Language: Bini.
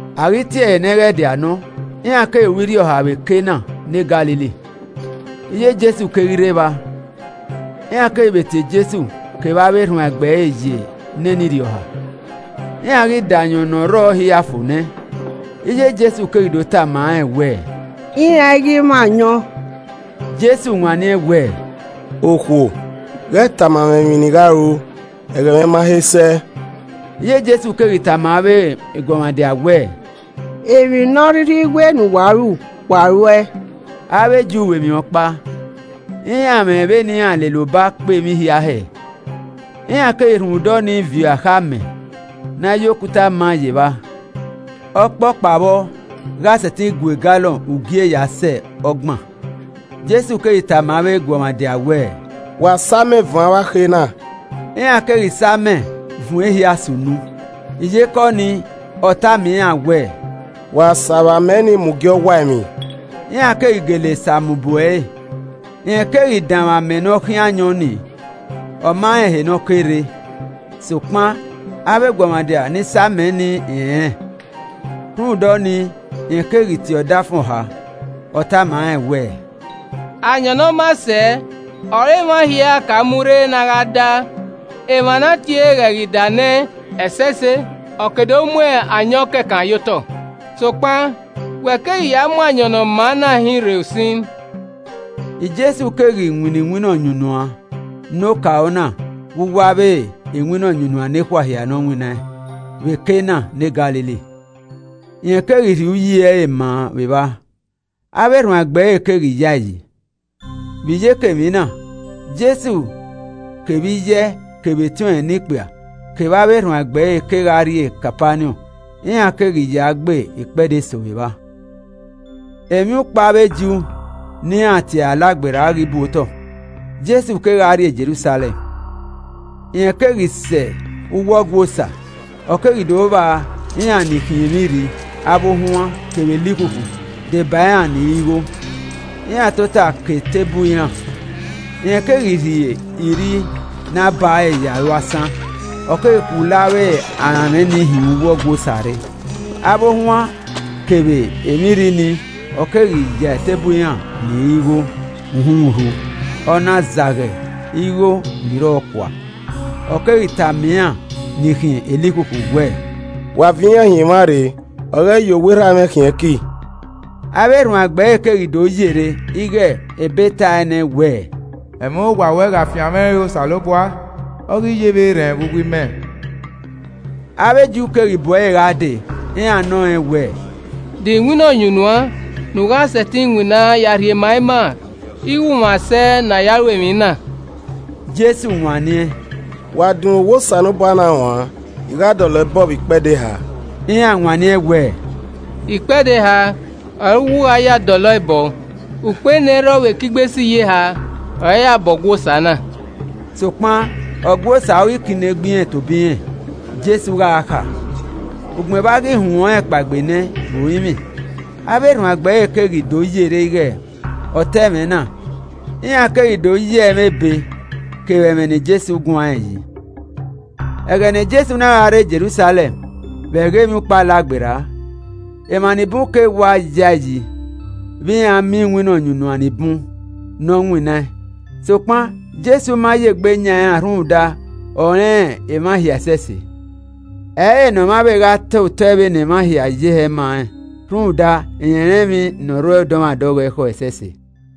A ghi tie ẹre nẹghẹdia nọ, iran keghi ru irhiọha vbe Kana ne Galili. Iye Jesu keghi rre evba. Iran keghi vbe tie Jesu kevbe avbe erhuanegbe ẹre ye nene irhiọha. Iran ghi da ayọn ne ọ rrọọ hia fo nẹ, iye Jesu keghi do tama rẹn wẹẹ, “Iran i ghi mwẹ ayọn!” Jesu wanniẹn wẹẹ, “Okhuo, ghẹ tama mwẹ emwi ne I gha ru. Ẹghẹ mwẹ ma he sẹ.” Iye Jesu keghi tama avbe eguọmwadia wẹẹ, “Emwi ne ọ rhirhi wẹ ne uwa ru, wa ru ẹe.” Avbe Ju ru emwi ọkpa, iran mwẹ vbene iran lele ọba kpe emwi hia hẹ. Iran keghi rhunmwuda ọnii viọ akhe amẹ ne a ya okuta ma ye evba, ọkpọkpa vbọ gha sẹtin gua egalọn ugie ya sẹ ọgban. Jesu keghi tama avbe eguọmwadia wẹẹ, “Wa sa amẹ vuọn avbe akhe na,” iran keghi sa amẹ vuọn ehia sẹ unu. Iyeke ọnii, ọ tama iran wẹẹ, “Wa sa vbe amẹ nii mu gie ọwaemwi.” Iran keghi gele sa mu bu ẹre. Rẹn keghi danmwẹ amẹ ne ọ khian ayọn ni, ọ ma rẹn ehe ne ọ ke rre, (sokpan avbe. eguọmwadia ni sa amẹ nii rẹnrẹn); rhunmwuda ọnii, rẹn keghi tie ọdafẹn ọha. Ọ tama rẹn wẹẹ, “Ayọn ne ọ maa sẹ ọre emwa nia ka mu rre ne a gha da, emwa ne a tiere ghẹ ghi da nẹ ẹsẹse, ọ ke do mu ayọn kẹkan ye otọ. Sokpan wẹ keghi ya mu ayọn ne ọ maa na hinrre usin.” Jesu keghi winna iwinna ọyunnuan ne okaro na vbe uwu avbe iwinna ọyunnuan nekhua hia ne ọ winnaẹn, vbe Kana ne Galili, rẹn keghi rhie uyi ẹre maa vbe evba, avbe erhuanegbe ẹre keghi yae yi. Vbe iyeke emwi na, Jesu kevbe iye ẹe, kevbe etiọnrẹn ne ikpia kevbe avbe erhuanegbe ẹre kegha rrie Kapaniọn, iran keghi ya gbe ikpẹdẹ eso vbe evba. Emwiukpo avbe Ju ne iran tie ẹre Alagberra ghi bu otọ, Jesu kegha rrie Jerusalẹm. Rẹn ghi sẹ uwu Ọgua Osa ọ keghi do vba iran ni khiẹn emwi irri, avbe ohuan, kevbe elikhukhu deba iran ni rọ igho, iran tota ke eteburu iran. Rẹn keghi rhie irri ne a bare ya ru asan, ọ keghi khulo avbe aranmwẹ nii hin uwu Ọgua Osa rre, avbe ohuan kevbe emwi irri nii, ọ keghi ya eteburu iran ni rọ igho uhunmwu rhu, ọ na zagha igho ni rrọọ kua. Ọ keghi tama iran ni khiẹn elikhukhu wẹẹ, “Wa viọ iran hin emwa rre, wa ghẹ ya owa Erha mwẹ khian ẹki.” Avbe erhuanegbe ẹre keghi do yerre ighe ebe tae nẹ wẹẹ, “Ẹmwẹ owa ruẹ gha fian mwẹ re Osanobua, ọ ghi ye vbe erhẹn vbe uwu imẹ.” Avbe Ju keghi bu ẹre gha dee, iran nọ rẹn wẹẹ, “De iwinna ọyunnuan ne u gha sẹtin winna ya rhie ma ima ighe u mwẹ asẹ ne a ya ru emwi na?” Jesu wanniẹn, “Wa dunmwu owa Osanobua na uan, I gha dọlọ ẹe bọọ vbe ikpẹdẹ eha.” Iran wanniẹn wẹẹ, “Ikpẹdẹ eha ọre u wẹ u gha ya dọlọ ẹe bọ? Ukpo enẹirrọ vbe ekigbe siyeha, ọre a ya bọ Ọgua Osa na.” Sokpan Ọgua Osa ọghe ikinegbe irẹn tobọ irẹn Jesu gha kha. Ugbẹn vbe a ghi huẹn ọnrẹn kpaegbe nẹ vbe orinmwi, avbe erhuanegbe ẹre keghi do yerre ighe ọ ta ẹmwẹ na, iran keghi do ya ẹmwẹ ebe kevbe ẹmwẹ ne Jesu guanrẹn yi. Ẹghẹ ne Jesu na gha rre Jerusalẹm vbe ẹghẹ Emwiukpo Alagberra, emwa ni bun keghi wa ya ẹe yi vbe iran miẹn iwinna ọyunnuan ni bun ne ọ winnaẹn. Sokpan Jesu ma ye egbe yan iran rhunmwuda ọ rẹn emwa hia ẹsẹse. Ẹ i re ne ọmwa vbe gha ta otọ vbene emwa ye hẹ ma rẹn rhunmwuda, rẹn rẹn emwi ne ọ rre dọmwadẹ ọghọe ekhọe ẹsẹse.